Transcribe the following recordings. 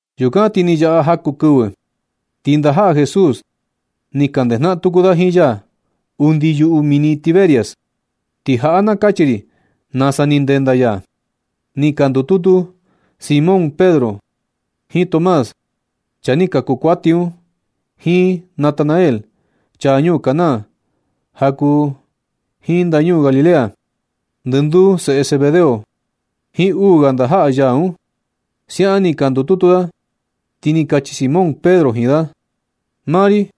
Yukan ti ni yaꞌa jaku kɨvɨ, ti ndajaꞌa Jesús ni ka ndejnaꞌan tuku da jiin ya undi yuꞌu mini Tiberias. Ti jaꞌa na kachi ri nasa ni ndenda ya. Ni ka ndututu Simón Pedro, jiin Tomás, chaa ni kaku kuati un, jiin Natanael, chaa ñuu Caná ja kuu jiin ndañuu Galilea, ndɨnduu seꞌe Zebedeo, jiin uu ga ndajaꞌa ya un. Siaꞌan ni ka ndututu da, ti ni kachi Simón Pedro jiin da: ―Maa ri,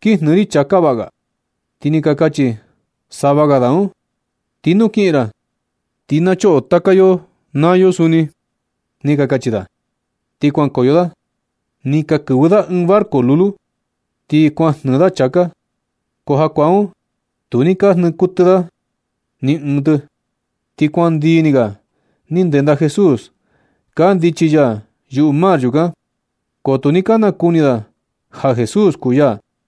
kin jnɨɨ ri chāká vaꞌga. Ti ni ka kachi sava ga da un: ―Ti nu kiꞌin ra, ti na choꞌo taka yo naa yo suni ―ni ka kachi da. Ti kuankoyo da, ni ka kɨvɨ da ɨɨn barco lulu, ti kuan jnɨɨ da chāká. Ko jakuaa un tu ni ka jnɨɨ kuɨtɨ da ni ɨɨn tɨ. Ti kuan ndii ni ga ni kenda Jesús kandichi ya yuꞌu mar yukan. Ko tu ni ka nakuni da ja Jesús kuu ya.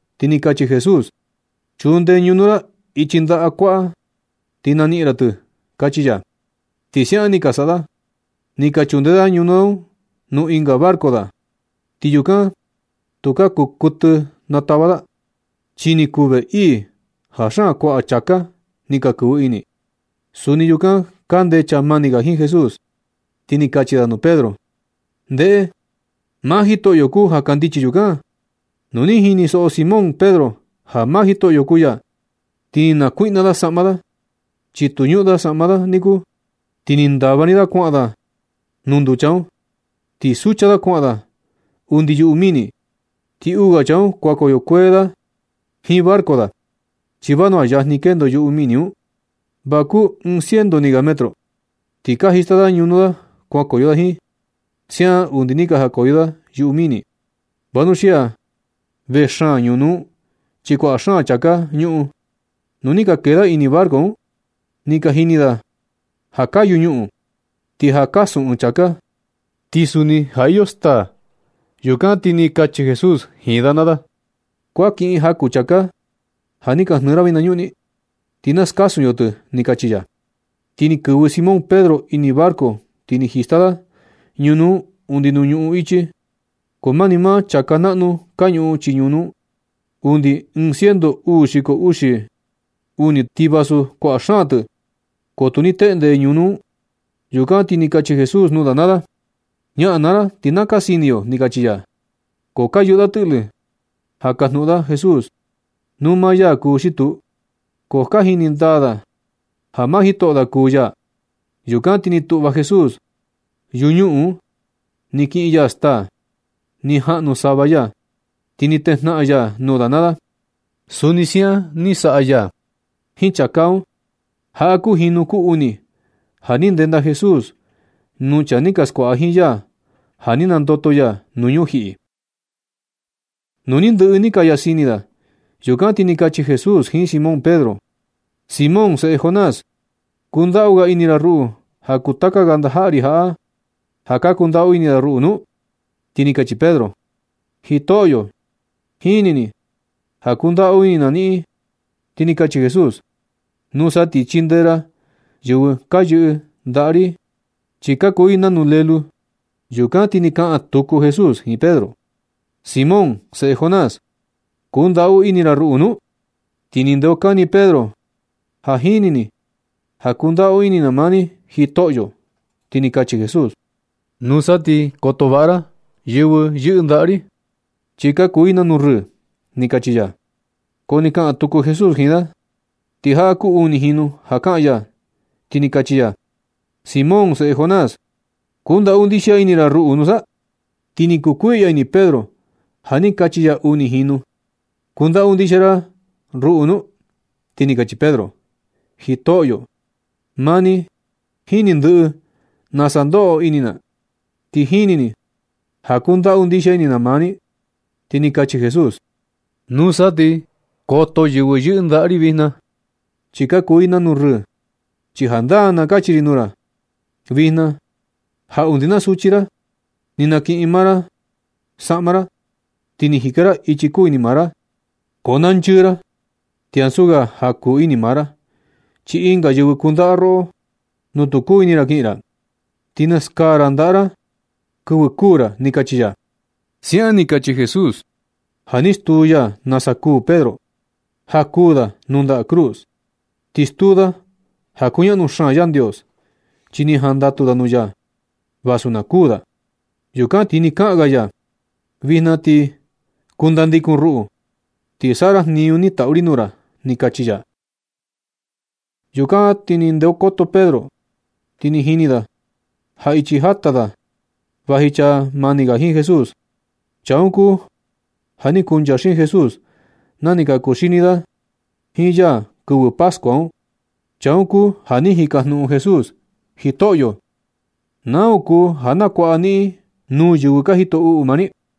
Ti ni kachi Jesús: ―Chunde ñunu ra ichi ndaꞌa kuaꞌa, ti na niꞌin ra tɨ ―kachi ya. Ti siaꞌan ni ka saꞌa da. Ni ka chunde da ñunu un nuu ɨnga barco da, ti yukan tukaa kuu kuɨtɨ natava da, chi ni kuu vee ii ja xaan kuaꞌa chāká ni ka kɨvɨ ini. Suni yukan kande chaa mani ga jiin Jesús, ti ni kachi da nuu Pedro: ―¡Ndeꞌe! ¡Maa Jitoꞌyo kuu ja kandichi yukan! Nu ni jinisoꞌo Simón Pedro ja maa Jitoꞌyo kuu ya, ti ni nakuiꞌna da saꞌma da, chi tu ñuꞌun da saꞌma da nikuu. Ti ni ndava ni da kuaꞌan da nuu nducha un, ti sucha da kuaꞌan da undi yuꞌu mini. Ti uu ga chaa un kuankoyo kuee da jiin barco da, chi vanua yajni kendo yuꞌu mini un, va kuu ɨɨn ciento ni ga metro. Ti ka jista da ñunu da kuankoyo da jiin. Siaꞌan undi ni ka jakoyo da yuꞌu mini, vanuxia vee xaan ñunu un, chi kuaꞌa xaan chāká ka ñuꞌun. Nu ni ka kee da ini barco un, ni ka jini da ja kayu ñuꞌun. Ti ja kasun ɨɨn chāká, ti suni ja iyo staa. Yukan ti ni kachi Jesús jiin da naa da: ―Kuan kiꞌin jaku chāká ja ni ka jnɨɨ ra vinañuꞌni, ti na skasun yo tɨ ―ni kachi ya. Ti ni kɨvɨ Simón Pedro ini barco, ti ni jista da ñunu un undi nuu ñuꞌun ichi. Ko mani maa chāká naꞌnu ka ñuꞌun chii ñunu un. Undi ɨɨn ciento uu xiko uxi uni tɨ. Ti vasu kuaꞌa xaan tɨ, ko tu ni teꞌnde ñunu un. Yukan ti ni kachi Jesús nuu da naa da: ―Ñaꞌan naa ra, ti na ka sini yo ―ni kachi ya. Ko ka yuꞌu da tɨꞌlɨ ja kajnuꞌun da Jesús nuu maa ya kuu xi tuu, ko ja ka jini ndaa da ja maa jitoꞌo da kuu ya. Yukan ti ni tuꞌva Jesús yuñuꞌun un, ni kiꞌin ya staa, ni jaꞌnu sava ya, ti ni tejnaꞌan ya nuu da naa da. Suni siaꞌan ni saꞌa ya jiin chāká un. Jaꞌa kuu jinu kuu uni ja ni ndenda Jesús nuu chaa ni ka skuaꞌa jiin ya, ja ni nandoto ya nuu ñujiꞌi. Nu ni ndɨꞌɨ ni ka yasini da, yukan ti ni kachi Jesús jiin Simón Pedro: ―Simón, seꞌe Jonás, ¿kundaꞌu ga ini ra ruꞌu ja kuu taka ga ndajaꞌa ri jaꞌa, ja ka kundaꞌu ini da ruꞌu nu? Ti ni kachi Pedro: ―Jitoꞌyo, jini ni ja kundaꞌu ini na niꞌin. Ti ni kachi Jesús: ―Nusa ti chindee ra yɨvɨ ka yɨꞌɨ ndaꞌa jiin ri, chi ka kuu i nanu lelú. Yukan ti ni kaꞌan tuku Jesús jiin Pedro: ―Simón, seꞌe Jonás, ¿kundaꞌu ini ra ruꞌu nu? Ti ni ndeokani Pedro: ―Ja jini ni ja kundaꞌu ini na maa ni, Jitoꞌyo. Ti ni kachi Jesús: ―Nusa ti koto vaꞌa ra yɨvɨ yɨꞌɨ ndaꞌa ri, chi ka kuu i nanu rɨɨ ―ni kachi ya. Ko ni kaꞌan tuku Jesús jiin da, ti jaꞌa kuu uni jinu ja kaꞌan ya, ti ni kachi ya: ―Simón, seꞌe Jonás, ¿kundaꞌu ndixia ini ra ruꞌu nusa? Ti ni kukuiꞌya ini Pedro ja ni kachi ya uni jinu: “¿Kundaꞌu ndixia ini ra ruꞌu nu?” Ti ni kachi Pedro: ―Jitoꞌyo, maa ni jini ndɨꞌɨ nasa ndoꞌo ini na, ti jini ni ja kundaꞌu ndixia ini na maa ni. Ti ni kachi Jesús: ―Nusa ti koto yɨvɨ yɨꞌɨ ndaꞌa ri vijna, chi ka kuu i nanu rɨɨ. Chi jandaa na kachi ri nuu ra vijna, ja undi na suchi ra ni nakiꞌin maa ra saꞌma ra, ti ni jika ra ichi ni kuu ini maa ra. Ko na nchɨɨ ra, ti ansu ga ja kuu ini maa ra, chi ɨnga yɨvɨ kundaꞌa da roꞌo nuu tu kuu ini ra kiꞌin ra, ti naskaa ra ndaꞌa ra kɨvɨ kuu ra ―ni kachi ya. Siaꞌan ni kachi Jesús ja ni stuu ya nasa kuū Pedro, ja kuū da nuu nda cruz. Ti stuu da ja kuñaꞌnu xaan Yandios, chi ni jandatu da nuu ya vasu na kuū da. Yukan ti ni kaꞌan ga ya: ―Vijna ti kundandikun ruꞌu, ti saꞌa ra jniñu ni tatu ri nuu ra ―ni kachi ya. Yukan ti ni ndeokoto Pedro, ti ni jini da ja ichi jata da vaji chaa mani ga jiin Jesús. Chaa un kuu ja ni kuncha xiin Jesús na ni ka kuxini da jiin ya kɨvɨ pascua un. Chaa un kuu ja ni jikajnuꞌun Jesús: “Jitoꞌyo, ¿nau kuu ja nakuaꞌa niꞌin nuu yɨvɨ ka jito uꞌu maa ni?”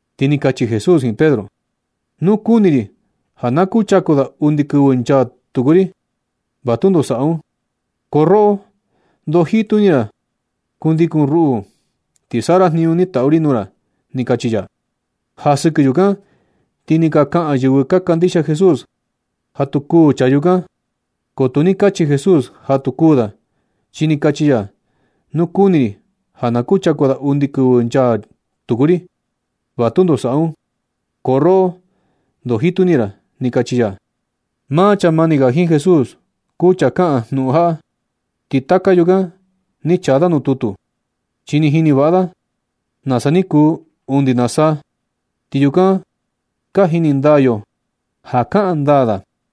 Ti ni kachi Jesús jiin Pedro: ―Nu kuni ri ja na kuchaku da undi kɨvɨ nchaa tuku ri, va tundo saꞌa un. Ko roꞌo, ndoo jitu ini ra. Kundikun ruꞌu, ti saꞌa ra jniñu ni tatu ri nuu ra ―ni kachi ya. Ja sɨkɨ yukan ti ni ka kaꞌan yɨvɨ ka kandixia Jesús ja tu kuū chaa yukan. Ko tu ni kachi Jesús ja tu kuū da, chi ni kachi ya: “Nu kuni ri ja na kuchaku da undi kɨvɨ nchaa tuku ri, va tundo saꞌa un. Ko roꞌo, ndoo jitu ini ra”, ni kachi ya. Maa chaa mani ga jiin Jesús, kuu chaa kaꞌan jnuꞌun jaꞌa, ti taka yukan ni chaa da nuu tutu. Chi ni jini vaꞌa da nasa ni kuu undi na saa. Ti yukan ka jini ndaa yo ja kaꞌan ndaa da.